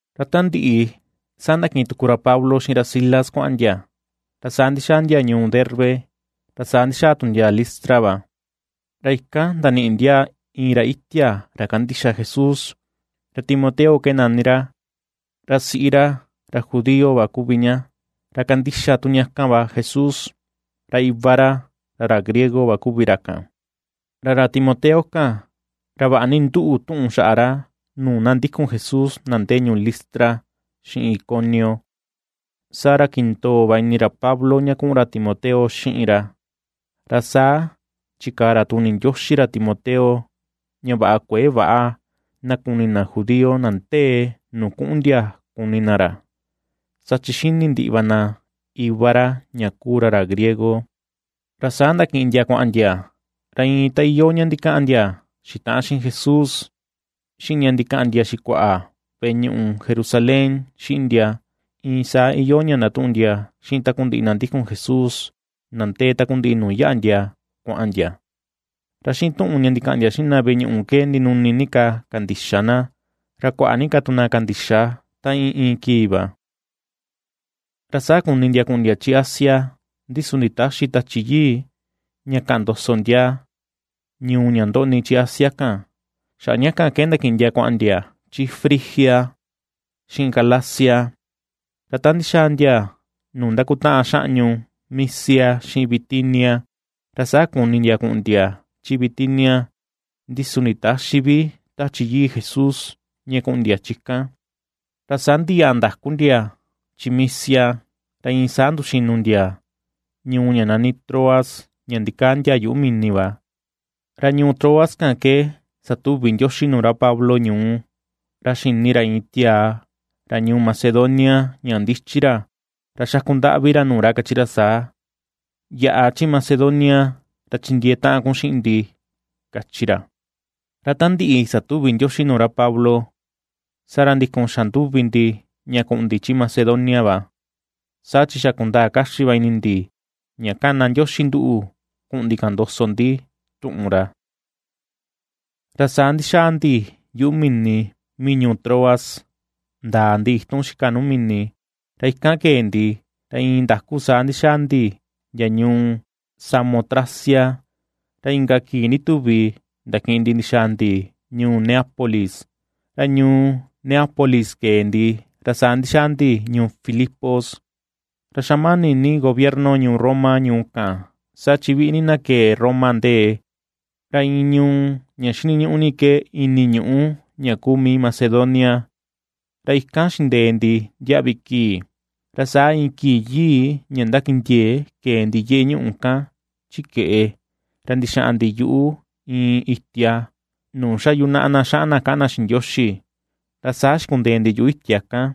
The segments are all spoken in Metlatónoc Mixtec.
Ra ta ndiꞌi, saa ndakiꞌin tuku ra Pablo xiꞌin ra Silas kuaꞌan ndia, ra saa ndixaa ndia ñuu Derbe, ra saa ndixaa tu ndia Listra va, ra ikan ndaniꞌi ndia iin ra itia ra kandixa Jesús, ra Timoteo ke nani ra, ra siꞌi ra ra judío kuvi ña, ra kandixa tu ña kan va Jesús, ra iva ra, ra ra griego va kuvi ra kan. Ra ra Timoteo kan, ra vaꞌa ni nduꞌu tuꞌun xaꞌa ra, nuu na ndikun Jesús na ndee ñuu Listra xiꞌin Iconio. Saa ra kindoo va ini ra Pablo ña kuꞌun ra Timoteo xiꞌin ra, ra saa chikaa ra tuni Ndioxi ra Timoteo ña vaꞌa kuëe väꞌa na kuni na judío na ndee nuu kuꞌun ndia kuni na ra, saa chi xini ndiꞌi va na iva ra ña kuu ra, ra griego. Ra saa ndakiꞌin ndia kuaꞌan ndia; ra iin ta iyoo ña ndikaꞌan ndia xitaꞌan xiꞌin Jesús, xiꞌin ña ndikaꞌan ndia xikuaꞌa veꞌe ñuꞌu Jerusalén xiꞌin ndia, iin saa iyoo ña ndatuꞌun ndia xiꞌin takundiꞌi na ndikun Jesús na ndee takundiꞌi ñuu nuu yaꞌa ndia kuaꞌan ndia. Ra xiꞌin tuꞌun ña ndikaꞌan ndia xiꞌin na veꞌe ñuꞌu ke ndinuni ni ka kandixa na, ra kuaꞌa ni ka tu na kandixa ta iin iin kii va. Ra saa kuni ndia kuꞌun ndia chi Asia, ndi su nditäxi Tachi Yii ña kaꞌan ndoso ndia ñuu ña ndoꞌni chi Asia kan. Xaꞌa ña kan ke ndakiꞌin ndia kuaꞌan ndia chi Frigia xiꞌin Galacia. Ra ta ndixaa ndia nuu ndakutaꞌan xaꞌñu Misia xiꞌin Bitinia, ra saa kuni ndia kuꞌun ndia chi Bitinia, ndi su nditäxi vi Tachi Yii Jesús ña kuꞌun ndia chi kan. Ra saa ndiyaꞌa ndaku ndia chi Misia, ra iin saa nduxinu ndia ñuu ña nani Troas ña ndikaa ndia yuꞌu mini va. Ra ñuu Troas kan ke satuvi Ndioxi nuu ra Pablo ñuú ra xini ra iin tiaa ra ñuu Macedonia ña ndichi ra, ra xakundaꞌvi ra nuu ra kachi ra saa: “Yaꞌa chi Macedonia ra chindiee taꞌan kun xiꞌin ndi”, kachi ra. Ra ta ndiꞌi satuvi Ndioxi nuu ra Pablo, saa ra ndikun xa nduvi ndi ña kuꞌun ndi chi Macedonia va, saa chi xa kundaa kaxi va ini ndi ña kana Ndioxi nduꞌu kuꞌun ndi kaꞌan ndoso ndi tuꞌun ra. Ra saa ndixaa ndi yuꞌu mini mii ñuu Troas, ndaa ndi itun xika nuu mini, ra ikan kee ndi, ra iin ndaku saa ndixaa ndi ndia ñuu Samotracia, ra inka kii ndituvi ndakiꞌin ndi ndixaa ndi ñuu Neápolis. Ra ñuu Neápolis kee ndi, ra saa ndixaa ndi ñuu Filipos, ra xa mani ni gobierno ñuu Roma ñuu kan, saa chi viꞌi ni na kee Roma ndee. Ra iin ñuu ña xiniñuꞌu ni ke ini ñuꞌu ña kuu mii Macedonia. Ra ikan xindee ndi ndiaꞌvi kii. Ra saa iin kii yii ña ndakindiee, kee ndi yeꞌe ñuu kan chi keꞌe, ra ndixaꞌan ndi yuꞌu iin itia nuu xa yunaꞌa na xaꞌan na kaꞌan na xiꞌin Ndioxi. Ra saa xikundee ndi yuꞌu itia kan,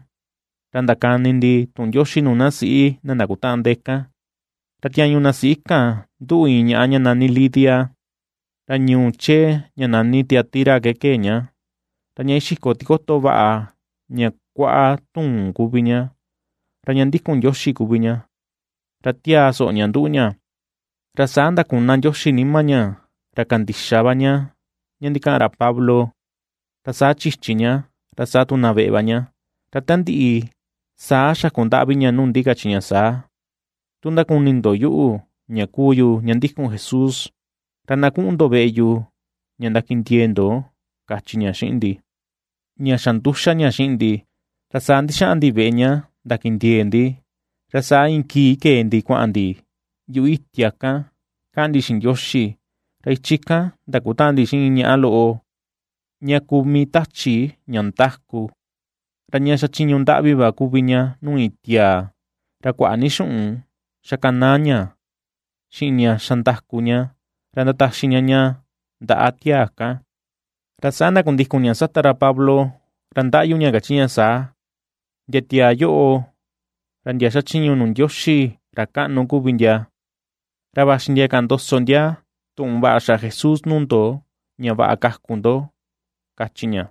ra ndakani ndi tuꞌun Ndioxi nuu na siꞌi na ndakutaꞌan ndee kan. Ra tiañu na siꞌi kan nduꞌu iin ñaꞌa ña nani Lidia, ra ñuu chee ña nani Tiatira ke kee ña; ra ña ixiko tikoto vaꞌa ña kuaꞌa tuun kuvi ña. Ra ña ndikun Ndioxi kuvi ña, ra tiaa soꞌo ña nduꞌu ña, ra saa ndakuna Ndioxi nima ña, ra kandixa va ña ña ndikaꞌan ra Pablo. Ra saa chichi ña, ra saa tu na veꞌe va ña, ra ta ndiꞌi saa xakundaꞌvi ña nuu ndi, kachi ña saa: ―Tu ndakuni ndo yuꞌu, ña kuu yu ña ndikun Jesús, ra na kuꞌun ndo veꞌe yu ña ndakindiee ndo ―kachi ña xiꞌin ndi. Ña xa nduxa ña xiꞌin ndi, ra saa ndixaꞌan ndi veꞌe ña ndakindiee ndi. Ra saa iin kii kee ndi kuaꞌan ndi yuꞌu itia kan kaꞌan ndi xiꞌin Ndioxi, ra ichi kan ndakutaꞌan ndi xiꞌin iin ñaꞌa loꞌo ña kuu mii tachi ña ndáku. Ra ña xachiñu ndaꞌvi va kuvi ña nuu iin tiaa, ra kuaꞌa ni xuꞌun xakanaa ña xiꞌin ña xa ndáku ña, ra ndataxi ña ña ndaꞌa tiaa kan. Ra saa ndakundikun ña sata ra Pablo, ra ndaꞌyu ña, ―Ndia tiaa yoꞌo, ra ndia xachiñu nuu Ndioxi ra kaꞌnu kuvi ndia, ra vaxi ndia kaꞌan ndoso ndia tuꞌun vaꞌa xaꞌa Jesús nuu ndo, ña vaꞌa kaku ndo ―kachi ña.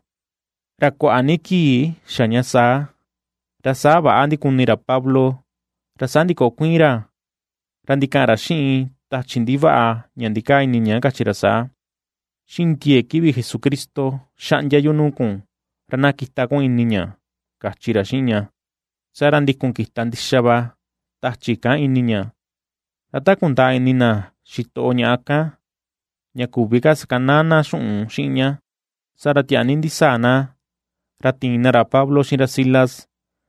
Ra kuaꞌa ni kii xa ña saa, ra saa väꞌa ndikuni ra Pablo, ra saa ndikokuiin ra ra ndikaꞌan ra xiꞌin tachi ndivaꞌa ña ndikaa ini ña, kachi ra saa: ―Xiꞌin ndiee kivi Jesucristo xaꞌndia yu nuu kun, ra na kita kun ini ña ―kachi ra xiꞌin ña. Saa ra ndikun kita ndixa va tachi kan ini ña. Ra ta kundaa ini na xitoꞌo ñaꞌa kan, ña küvi ka sakanaa na xuꞌun xiꞌin ña, saa ra tiaa ni ndisaa na ra tiin na ra Pablo xiꞌin ra Silas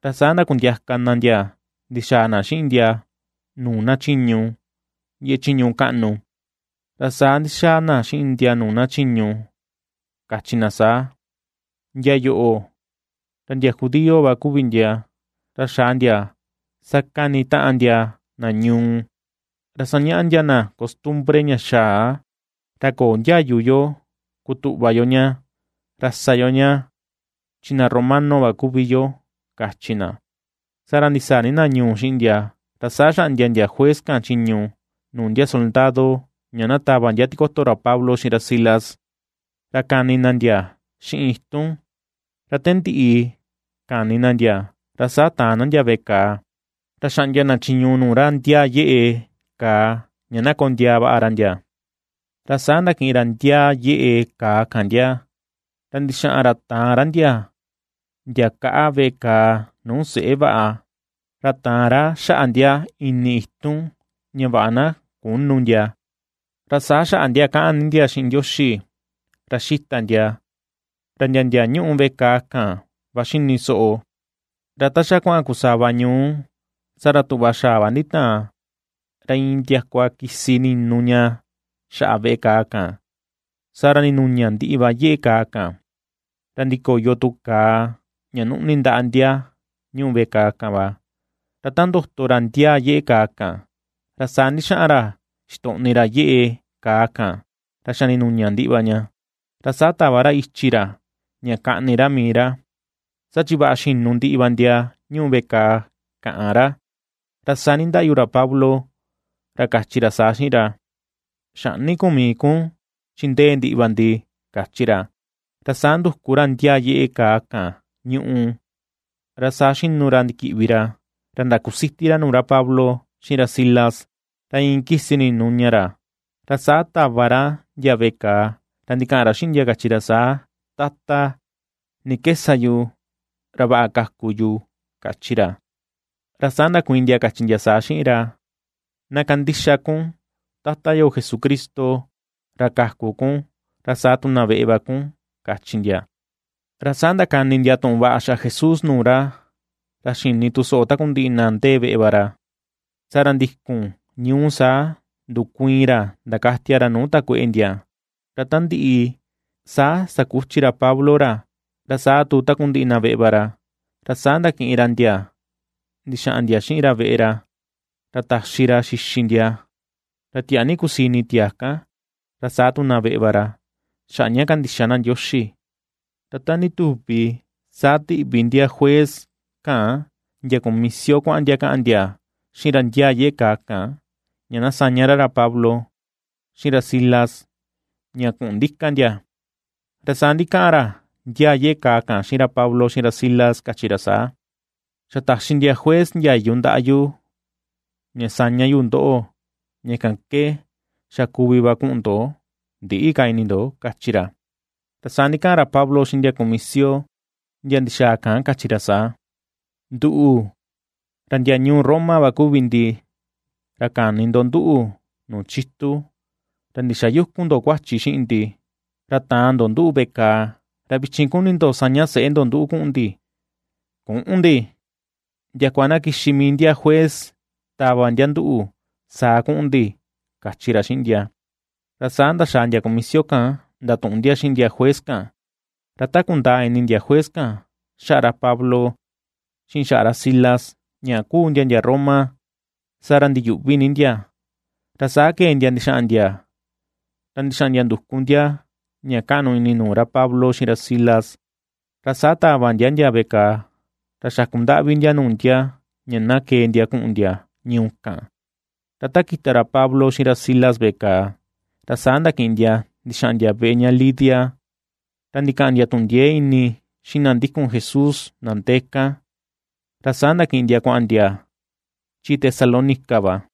ra saa ndakundiaka na ndia ndixaa na xiꞌin ndia nuu na chiñu, yeꞌe chiñu kaꞌnu. Ra saa ndixaa na xiꞌin ndia nuu na chiñu, kachi na saa: ―Ndia yoꞌo, ra ndia judío va kuvi ndia, ra xaa ndia sakanitaꞌan ndia na ñuu, ra sañaꞌa ndia na costumbre ña xaa, ra köo ndiayu yo kutuꞌva yo ña, ra sa yo ña, chi na romano va kuvi yo ―kachi na. Saa ra ndisaa ni na ñuu xiꞌin ndia, ra saa xaꞌndia ndia juez kan, chiñu nuu ndia soldado ña na tava ndia tikoto ra Pablo xiꞌin ra Silas, ra kani na ndia xiꞌin itun. Ra ta ndiꞌi kani na ndia, ra saa taan na ndia veꞌe kàà. Ra xaꞌndia na chiñu nuu ra ndiaa yeꞌe kaa ña na kondiaa vaꞌa ra ndia. Ra saa ndakiꞌin ra ndia yeꞌe kaa kan ndia, ra ndixaꞌan ra taan ra ndia ndia kaꞌa veꞌe kàà nuu seꞌe vaꞌa, ra taan ra xaꞌa ndia ini itun ña vaꞌa na künu ndia. Ra saa xaꞌa ndia kaꞌan ni ndia xiꞌin Ndioxi ra xita ndia, ra ndia ndia ñuꞌu veꞌe kaa kan va xini soꞌo. Ra ta xa kuaꞌan kusava ñuu, saa ra tuꞌva xaꞌa va nditaan, ra iin ndiakua kisi ninu ña xaꞌa veꞌe kàà kan. Saa ra ndinuña ndiꞌi va yeꞌe kaa kan, ra ndikoyo tu kaa, ña nuꞌni ndaꞌa ndia ñuꞌu veꞌe kàà kan va. Ra ta ndoto ra ndiaa yeꞌe kaa kan, ra saa ndixaꞌan ra xitoꞌni ra yeꞌe kaa kan ra xa ndinuña ndiꞌi va ña, ra saa tava ra ichi ra ña kaꞌni ra mii ra, saa chi vaꞌa xinu ndiꞌi va ndia ñuꞌu veꞌe kàà, káꞌán ra. Ra saa nindaꞌyu ra Pablo, ra kachi ra saa xiꞌin ra: ―Xäꞌni kun mii kun chi ndee ndiꞌi va ndi ―kachi ra. Ra saa nduku ra ndia yeꞌe kàà kan ñuꞌu, ra saa xinu ra ndikiꞌvi ra, ra ndakusiti ra nuu ra Pablo xiꞌin ra Silas, ra iin kisi ninu ña ra. Ra saa taꞌva ra ndia veꞌe kàà, ra ndikaꞌan ra xiꞌin ndia, kachi ra saa: ―Tata, ¿ni ke sa yu ra vaꞌa kaku yu? ―kachi ra. Ra saa ndakuiin ndia, kachi ndia saa xiꞌin ra: ―Na kandixa kun Tata yo Jesucristo ra kaku kun, ra saa tu na veꞌe va kun ―kachi ndia. Ra saa ndakani ndia tuꞌun vaꞌa xaꞌa Jesús nuu ra, ra xini tu soꞌo takundiꞌi na ndee veꞌe va ra. Saa ra ndikun ñuu saa, ndukuiin ra ndakatia ra nuu takueꞌe ndia. Ra ta ndiꞌi, saa sakuchi ra Pablo ra, ra saa tu takundiꞌi na veꞌe va ra. Ra saa ndakiꞌin ra ndia ndixaꞌan ndia xiꞌin ra veꞌe ra, ra taxi ra xixi ndia. Ra tiaa ni kusii ini tiaa kan, ra saa tu na veꞌe va ra xaꞌa ña kandixa na Ndioxi. Ra ta ndituvi saa tiꞌvi ndia juez kan ndia kumisio kuaꞌan ndia kaꞌan ndia xiꞌin ra ndiaa yeꞌe kaa kan, ña na saña ra ra Pablo, xiꞌin ra Silas ña kuꞌun ndika ndia. Ra saa ndikaꞌan ra ndiaa yeꞌe kaa kan xiꞌin ra Pablo xiꞌin ra Silas, kachi ra saa: ―Xa taxi ndia juez ndiayu ndaꞌa yu ña saña yu ndoꞌo, ña kan ke xa kuvi va kuꞌun ndo ndiꞌi ka ini ndo ―kachi ra. Ra saa ndikaꞌan ra Pablo xiꞌin ndia kumisio ndia ndixaa kan, kachi ra saa: ―Nduꞌu, ra ndia ñuu Roma va kuvi ndi, ra kani ndo nduꞌu nuu chitu, ra ndixayükun ndo kuachi xiꞌin ndi, ra taan ndo nduꞌu veꞌe kàà. Ra vichin kuni ndo saña seꞌe ndo nduꞌu kuꞌun ndi. ¡Küꞌun ndi! Ndiakua na kixi mii ndia juez tava ndia nduꞌu, saa kuꞌun ndi ―kachi ra xiꞌin ndia. Ra saa ndaxaa ndia kumisio kan ndatuꞌun ndia xiꞌin ndia juez kan, ra ta kundaa ini ndia juez kan, xaꞌa ra Pablo xiꞌin xaꞌa ra Silas ña kuu ndia ndia Roma, saa ra ndiyuꞌvi ni ndia. Ra saa kee ndia ndixaꞌan ndia, ra ndixaꞌan ndia nduku ndia ña kaꞌnu ini nuu ra Pablo xiꞌin ra Silas, ra saa tava ndia ndia veꞌe kàà, ra xakundaꞌvi ndia nuu ndia ña na kee ndia kuꞌun ndia ñuu kan. Ra ta kita ra Pablo xiꞌin ra Silas veꞌe kàà, ra saa ndakiꞌin ndia ndixaꞌan ndia veꞌe ña Lidia, ra ndikaꞌan ndia tuꞌun ndiee ni xiꞌin na ndikun Jesús na ndee kan, ra saa ndakiꞌin ndia kuaꞌan chi Tesalónica va.